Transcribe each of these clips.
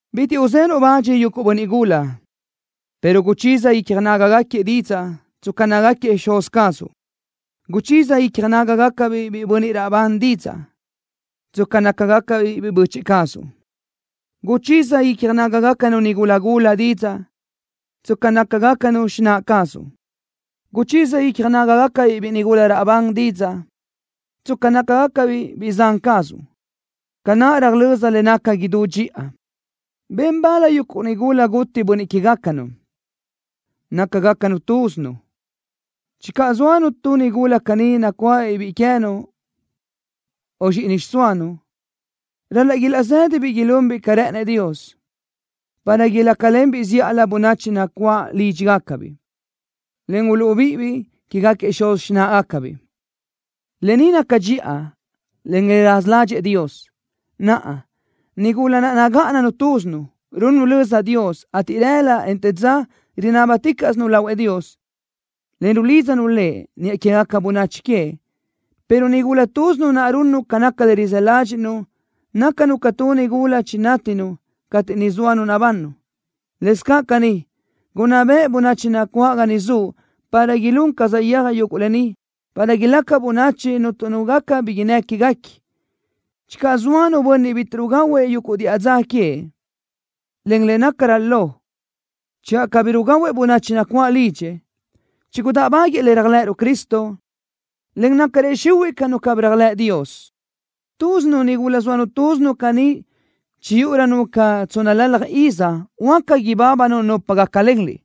Bitiʼ uzenuʼ bach yuguʼ bönniʼ gula, pero guchiza icja nágagaquiëʼ didzaʼ, tsca nácagaquiëʼ xuz cazuʼ. Guchiza icja nágagacabiʼ biʼi bönniʼ raʼbán didzaʼ, tsca nácagacabiʼ biʼi böchiʼ cazuʼ. Guchiza icja nágagacanu nigula gula didzaʼ, tsca nácagacanu xináʼ cazuʼ. Guchiza icja nágagacabiʼ biʼi nigula raʼbán didzaʼ, tsca nácagacabiʼ biʼi zan cazuʼ, ca naʼ röjlö́z le naca idú dxiʼa. Ben bal yuguʼ nigula ba guti bönniʼ que queë́gacanu, nácagacanu túzinu. Channö zóanu tu nigula caní nacuáʼabiʼ biʼi queë́nu o zxíʼini xiʼsóanu, ral-laʼ ilaʼzë́dabiʼ ilunbiʼ ca rë́ʼënëʼ Dios, para ilácalenbiʼ zíʼalö bönachi nacuáʼ lídxigacabiʼ, en uluʼbíʼibiʼ quégaquiëʼ xuz xináʼagacabiʼ. Lë ni naca dxiʼa, en le raza ládxëʼë Dios. Naʼa, nigula naʼ nagáʼananu túzinu, runnu löza Dios, ateʼ rëla, en te dza rinábaticaʼsinu lahuëʼ Dios, en rulídzanu Lëʼ niʼa quégaca bönachi queëʼ, pero nigula túzinu naʼ runnu ca naca le rizë́ ládxiʼnu nácanu ca tu nigula chinátinu cateʼ ni zóanu nabannu. Lëscaʼ caní, gunná beʼe bönachi nacuáʼ ga niʼ zuʼ, para ilún ca saʼyéaj yuguʼ lë ni, para ilaca bönachi cuntu nu gaca bi innë́ quéguequi. Channö zoa nu bönniʼ cabí rugahuëʼ yuguʼ diʼa dza queëʼ, en le nácarö lo, channö cabí rugahuëʼ bönachi nacuáʼ lidxëʼ, chigudáʼbaguëʼë le réajlëʼëruʼ Cristo, en nácarëʼ xihuiʼ ca nu cabí réajlëʼ Dios. Túzinu nigula zoanu túzinu caní chiyúʼurönu ca tsónnalalaj iz huáca ibábanu nupa gácalenliʼ,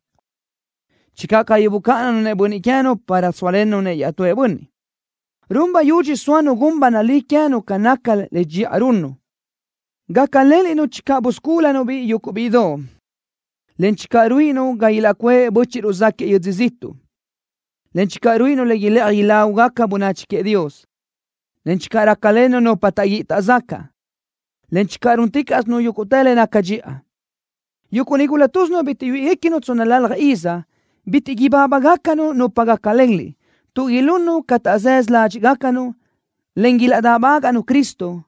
channö cabí bucáʼananu-nëʼ bönniʼ queë́nu para sóalennu-nëʼ iaʼtúëʼ bönniʼ. Run bayudxi soa nu gun ba nalí queë́nu ca nácagaca le dxiʼa runnu. Gácalenliʼ-nu channö buscúlunu-biʼ yuguʼ bíʼidoʼ, en channö ruíʼinu ga ilaʼcuáʼ bö́chiʼruʼ záʼgaquiëʼ yödzö ziʼtuʼ, en channö ruíʼinu le ilëʼaj ilágugaca bönachi queëʼ Dios, en channö rácalennu nupa taʼguíʼi taʼzacaʼ, en channö rúnticaʼsinu yúguʼtë le naca dxiʼa. Yuguʼ nigula túzinu bitiʼ yuíʼigacanu tsónnalalaj iz, bitiʼ ibábagacanu nupa gácalenliʼ, tuʼ ilunnu ca taʼzësö ládxiʼgacanu, en ilaʼdáʼbagaʼnu Cristo,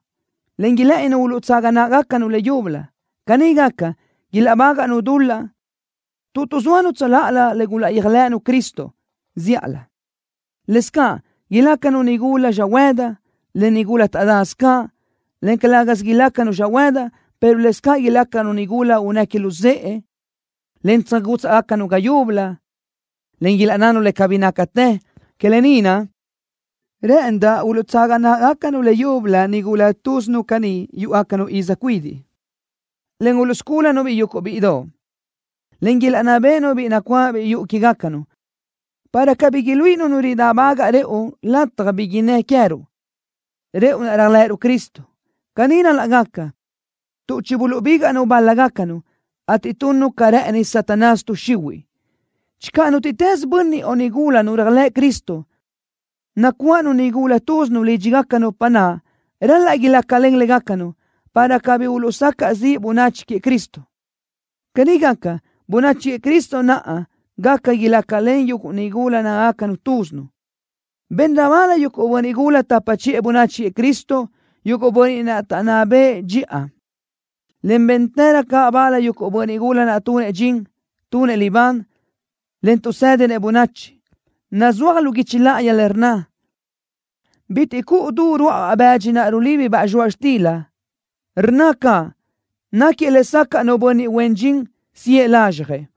en ilë́ʼëninu uluʼtsaga náʼagacanu leyúbölö. Caní gaca, ilaʼbágaʼnu dul-laʼ tuʼ tuʼzóanu tsöláʼalö le gulaʼyéajlëʼënu Cristo zíʼalö. Lëscaʼ ilácanu nigula xöhuëdi, en nigula taʼdasö caʼ, en calë́gasö ilácanu xöhuëdi, pero lëscaʼ ilácanu nigula unnë́ que luzë́ʼe, en tsöjgútsaʼgacanu ga yúbölö, en ilaʼnnanu le cabí nácatë. Que lë ni naʼ, rë́ʼëndaʼ uluʼtsaga náʼgacanu leyúbölö nigula túzinu cani yúʼugacanu iz cuidiʼ, en uluʼscúlanu-biʼ yuguʼ bíʼidoʼ, en ilaʼnná béʼenu biʼi nacuáʼabiʼ yuʼu que queë́gacanu, para cabí iluíʼinu nu ridáʼbagaʼ rëʼu lataj bi innë́ queë́ruʼ, rëʼu naʼ réajlëʼëruʼ Cristo. Caní ral-laʼ gaca, tuʼ chibuluʼbígaʼnu bál-lagacacnu, ateʼ tunnu ca rë́ʼëni Satanás tuʼ xihuiʼ. Channö nútiʼtës bönniʼ o nigula nu réajlëʼ Cristo, nacuáʼanu nigula túzinu lídxigaca nupa naʼ, ral-laʼ ilácalen légacanu, para cabí uluʼsacaʼ ziʼ bönachi queëʼ Cristo. Caní gaca, bönachi queëʼ Cristo naʼ gaca ilácalen yuguʼ nigula nagáʼanagacanu túzinu. Benrö bal yuguʼ bönniʼ gula tapa chiʼë bönachi queëʼ Cristo, yuguʼ bönniʼ naʼ taʼnná bëʼë dxiʼa, en béntërö caʼ bal yuguʼ bönniʼ gula naʼ tunëʼ dxin, tunëʼ libán, en tuʼsédinëʼ bönachi. Nazúaj lu guichi láʼayi le rnna: “Bitiʼ cuʼu du ruáʼabaʼ bëdxi naʼ rulíbibaʼ zxoaʼ xtila.” Rnna caʼ: “Náquiëʼ lesacaʼ nu bönniʼ huen dxin siʼë lazxjëʼ.”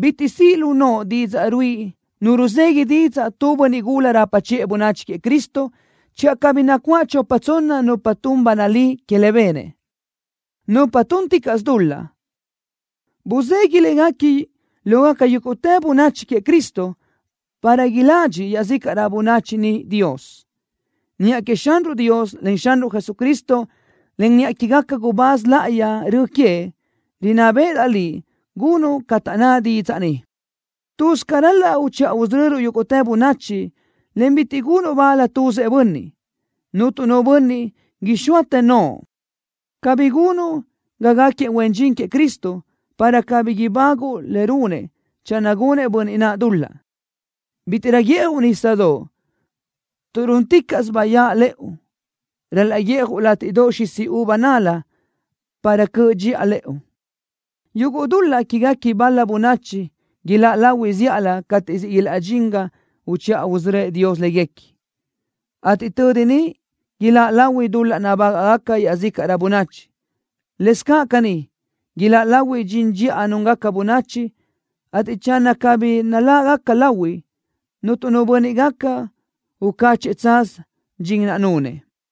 Bitiʼ siʼ lu noʼo didzaʼ ruíʼi nu ruzegui didzaʼ tu bönniʼ gula rapa chiʼë bönachi queëʼ Cristo, channö cabí nacuáʼ chopa tsonna nupa tun ba nalí que le benëʼ. Nupa túnticaʼsö dul-laʼ, busidxi léguequi lógaca yúguʼtë bönachi queëʼ Cristo para iladxi iaʼzícaʼrö bönachi niʼ Dios. Niʼa queëʼ Xanruʼ Dios, en Xanruʼ Jesucristo, en niʼa quégaquiëʼ gubáz láʼayi rö queëʼ, rinná béʼedaʼ liʼ gunuʼ ca taʼnná didzaʼ ni. Tuz ca ral-laʼ uchiʼa usörö́uʼ yúguʼtë bönachi, en bitiʼ gunuʼ bal tuzëʼ bönniʼ. Cuntu nu bönniʼ ixóatë noʼo, cabí gunuʼ ga gáquiëʼ huen dxin queëʼ Cristo, para cabí ibáguʼu le runëʼ channö gunëʼ bönniʼ naʼ dul-laʼ. Bítiʼrö guíʼjuʼ nísasö. Tuʼ rúnticaʼsö bayáʼ lëʼu ral-laʼ guíʼjuʼ látiʼdoʼ xisi uva nal-la para cöʼ dxiʼa lëʼu. Yuguʼ dul-laʼ quéguequi bal-la bönachi ilaʼláʼ lahui zíʼalö cateʼ siʼ ilaʼdxín ga uchiʼa usörö́ëʼ Dios léguequi, ateʼ tödi niʼ ilaʼláʼ lahui dul-laʼ nabágaʼgaca iaʼzícaʼrö bönachi. Lëscaʼ caní, ilaʼláʼ lahui dxin dxiʼa núngaca bönachi, ateʼ channö cabí naláʼgaca lahui, cuntu nu bönniʼ gaca ucáchëʼë tsaz dxin naʼ nunëʼ.